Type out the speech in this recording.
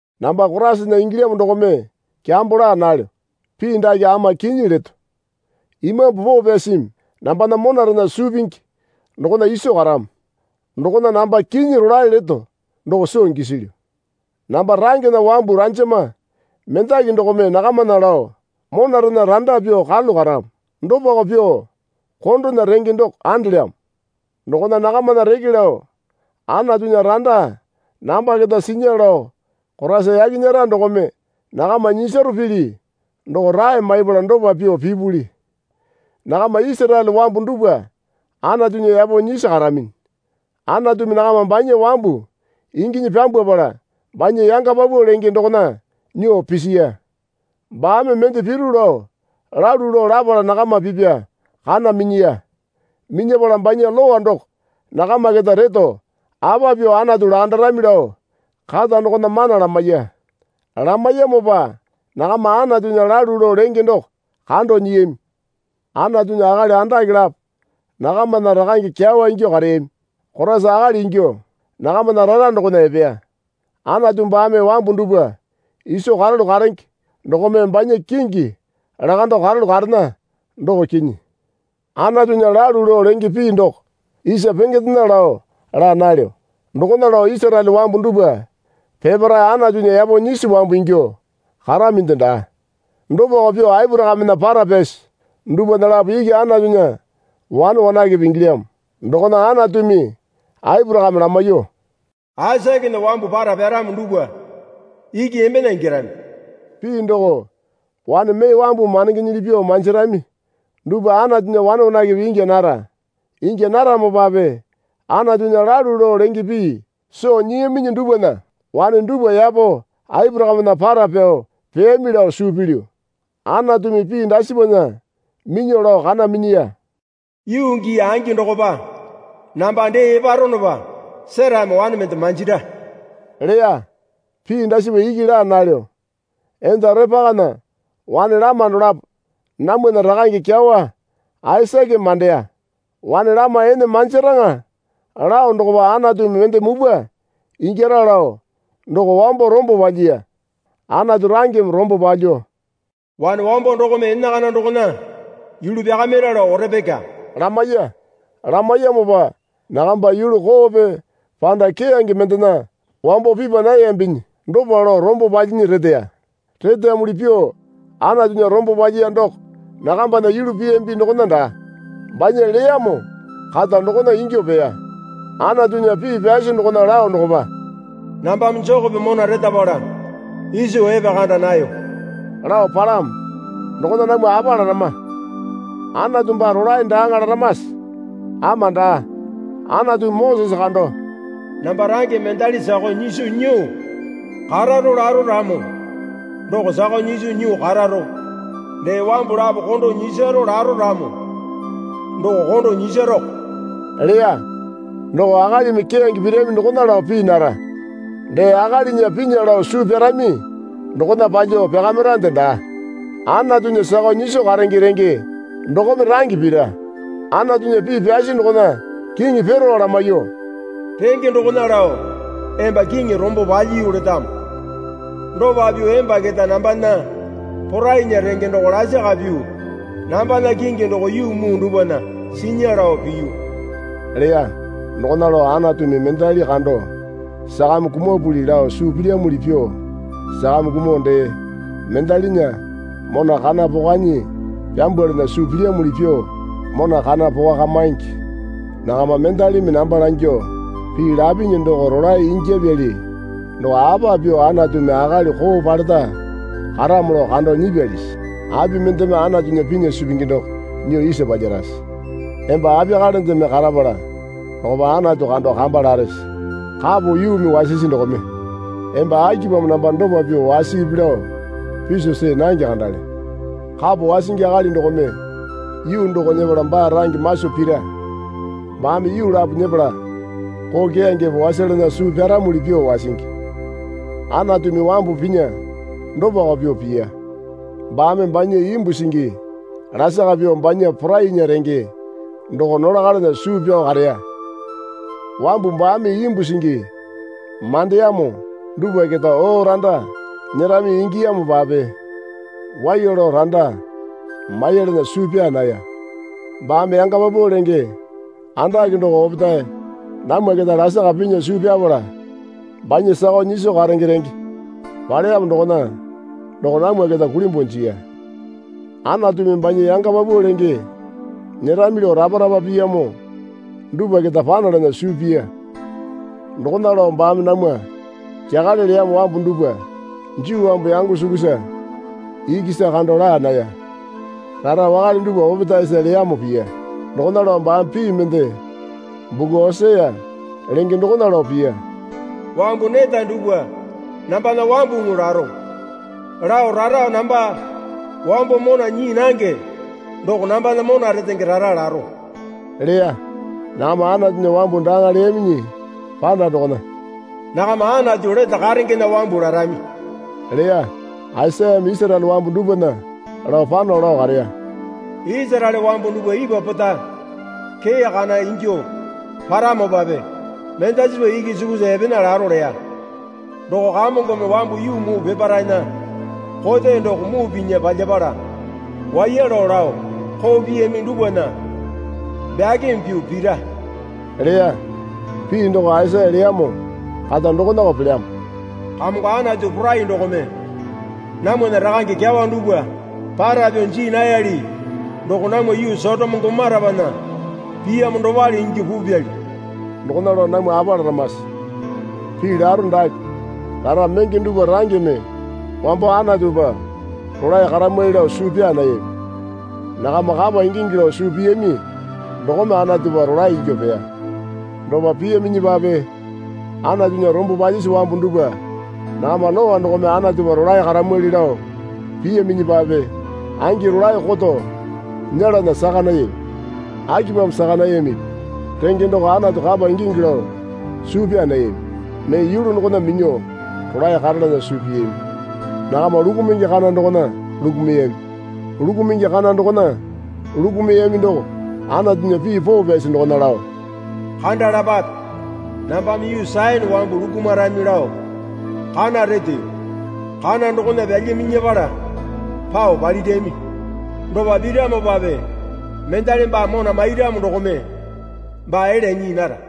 Namba Koraisana ingilyamo dokome kyambo laa nalyo. Pii dake ama kinyi leto. Imambu Poo Pyasimi nambana monarena suu pingi dokona iso karamo. Dokona namba kinyi rolae leto doko soo gisilyu. Namba rangena wambu ranjama mendaki dokome nakamana lao monarena randa pyuo karalu karamo. Dopako pyuo kondona renge doko andelyamo. Dokona nakamana reke lao Anatunya randa namba keta sinya lao Koraisa yaki nyera dokome nakama nyisaro pili doko rae maipala dopa pyuo pipuli. Nakama Isaraele wambu dupwa Anatunya yapo nyisi karaminyi. Anatumi nakama banya wambu inginyi pyambwapala banya yanga paupau lenge dokona nyuo pisiya. Baame mende piru lao lalu lao lapala nakama pipya kana minyiya. Minyapala banya Lowa doko nakama keta reto apa pyuo Anatu lakandarami lao kata dokona mana lamaiya. Lamaiyamopa nakama Anatunya lalu lao lenge doko kando nyiyami. Anatunya akali andake lapo nakamana rakange kyawa ingyuo kareyami. Koraisa akali ingyuo nakamana rara dokona epeya. Anatu baame wambu dupwa iso karalu karenge dokome banya kingi lakando karalu karena, doko kinyi. Anatunya lalu lao lenge pii doko isa pengendena lao laa nalyo. Dokona lao Isaraele wambu dupwa peparae Anatunya yapo nyisi wambu ingyuo karaminde daa. Dopako pyuo Aporakamena para pyasi dupwana lapo iki Anatunya wane wanakepe ingilyamo. Dokona Anatumi Aporakame lamaiyuo, Aisakena wambu para pyaramo dupwa iki embena ingyarami. Pii doko wane mee wambumi mandengenyili pyuo manjirami dupwa Anatunya wane wanakepe ingya nara. Ingya naramopape Anatunya lalu lao lenge pii soo nyiyaminyi dupwana wane dupwa yapo Aporakamena para pao peyami lao suu pilyu. Anatumi pii dasipana minyuo lao kana minyiya. Yuu gii angi dokopa namba dee eparanopa Serame wane mende manjira leya. Pii dasipa iki laa nalyo. Enda Orepekana wane lama dolapo namwana rakange kyawa Aisakeme mandeya. Wane lama ene manjaraŋa lao dokopa Anatumi mende mupwa ingyara lao doko wambo rombo palyiya. Anatu rangeme rombo palyuo, Wane wambo dokome enakana dokona yulu pyakamira lao Orepeka lamaiya. Lamaiyamopa nakamba yulu koope panda keyange mendena wambo pipa nayambinyi dopa lao rombo palyinyi reteya. Reteyamuli pyuo Anatunya rombo palyiya doko nakambana yulu piyambi dokona daa. Banya leyamo kata dokona ingyuo peya. Anatunya pii pyasi dokona lao dokopa, Nambame Jekope mona retapala Iso epekanda nayo lao palamo. Dokona namwa apa larama? Anatu baa rolae daaŋa laramase? Ama daa. Anatumi Mosese kando, Namba rangeme mendali sakao nyiso nyuo kararo laro ramo doko sakao nyiso nyuo kararo. Dee wambu lapo kondo nyisaro laro ramo doko kondo nyisaroko leya. Doko akalimi keyange pirami dokona lao pii nara. Dee akalinya pinya lao suu pyarami dokona palyuo pyakamirande daa. Anatunya sakao nyiso karenge renge dokome range pira. Anatunya pii pyasi dokona kiŋi Perao lamaiyuo, Renge dokona lao emba kiŋi rombo palyiyu letamo. Dopa pyuo emba keta nambana porainya renge doko lasaka pyuo nambana kingi doko yuu muu dupwana sinya lao piyu leya. Dokona lao Anatumi mendali kando sakame kumapuli lao suu pilyamuli pyuo sakame kumuo dee mendalinya mona kana pokanyi pyambwalana suu pilyamuli pyuo mona kana pokakamingi. Nakama mendalimi namba langyuo, Pii lapinyi doko rolae ingyapyali doko apa pyuo Anatumi akali koo paleta karamo lao kando nyipyalisi? Api mendeme Anatunya pinya suu pingi doko nyuo isa palyarase? Emba apiyakalendeme karapala dokopa Anatu kando kamba larese? Kapo yuumi wasisi dokome, Emba akipamo namba dopa pyuo wasipi lao piso see nange kandale. Kapo wasingi akali dokome yuu doko nyepala baa range maso pira. Baame yuu lapo nyepala koo keyangepe wasalana suu pyaramuli pyuo wasingi. Anatumi wambu pinya dopako pyuo piya. Baame banya imbu singi lasaka pyuo banya porainya renge doko nolakalana suu pyao kareya. Wambu baame imbu singi mandeyamo dupwa keta oo randa nyerami ingiyamopape waiya lao randa mailana suu pyaa naya. Baame yanga paupau lenge andake doko opetae namwa keta lasaka pinya suu pyapala banya sakao nyiso karenge renge paleyamo dokona doko namwa keta kulimbuo jiya. Anatumi banya yanga paupau lenge nyerami lao rapa rapa piyamo dupwa keta panalana suu piya. Dokona lao baame namwa kyakale leyamo wambu dupwa. Juu wambu yango sukusa ikisa kando laa naya. Rara wakale dupwa opetaesa leyamo piya. Dokona lao baame pii mende buku Osia lenge dokona lao piya. Wambu neta dupwa nambana wambuŋu laro lao rara namba wambo mona nyii nange doko nambana mona retenge rara laro leya. Nakama Anatunya wambu daaŋa leyaminyi panda dokona, nakama Anatu lete karengena wambu larami leya. Aisayame Isaraele wambu dupwana lao pano lao kareya. Isaraele wambu dupwa ipwa pota kee kana ingyuo paramopape mendasipa iki sukusa epena laro leya. Doko Kamongome wambu yuu muu peparaena kote doko muu pinya palyapala waiya lao lao koo piyami dupwana bakimi pyuo pira leya. Pii doko Aisaya leyamo kata dokonako pelyamo. Kamongo Anatu Porai dokome namwana rakange kyawa dupwa para pyao jii nayali doko namwa yuu Sotoma Gomorapana piyamo dopale ingyuo pupyali. Dokona lao namwa apa laramase? pii laro dake. Rara menge dupwa rangeme wambo Anatupa rolae karamwali lao suu pyaa nayami. Nakama kapa ingingi lao suu piyami dokome Anatupa rolae ingyuo peya. Dopa piyaminyipape Anatunya rombo palyisi wambu dupwa nakama lowa dokome Anatupa rolae karamwali lao piyaminyipape angi rolae koto nyelana saka nayami. Akipamo saka nayamipi? Renge doko Anatu kapa ingingi lao suu pyaa nayami. Mee yulu dokona minyuo rolae karalana suu piyami. Nakama lukumungi kana dokona lukumuyami. Lukumungi kana dokona lukumuyami doko Anatuya pii poo pyasi dokona lao, Kandalapape, nambame yuu Sayone wambu lukumarami lao kana reteyo. Kana dokona pyalyaminyapala pao palirami. Dopa piramopape mendali baa mona mairamo dokome baa elya nyii nara.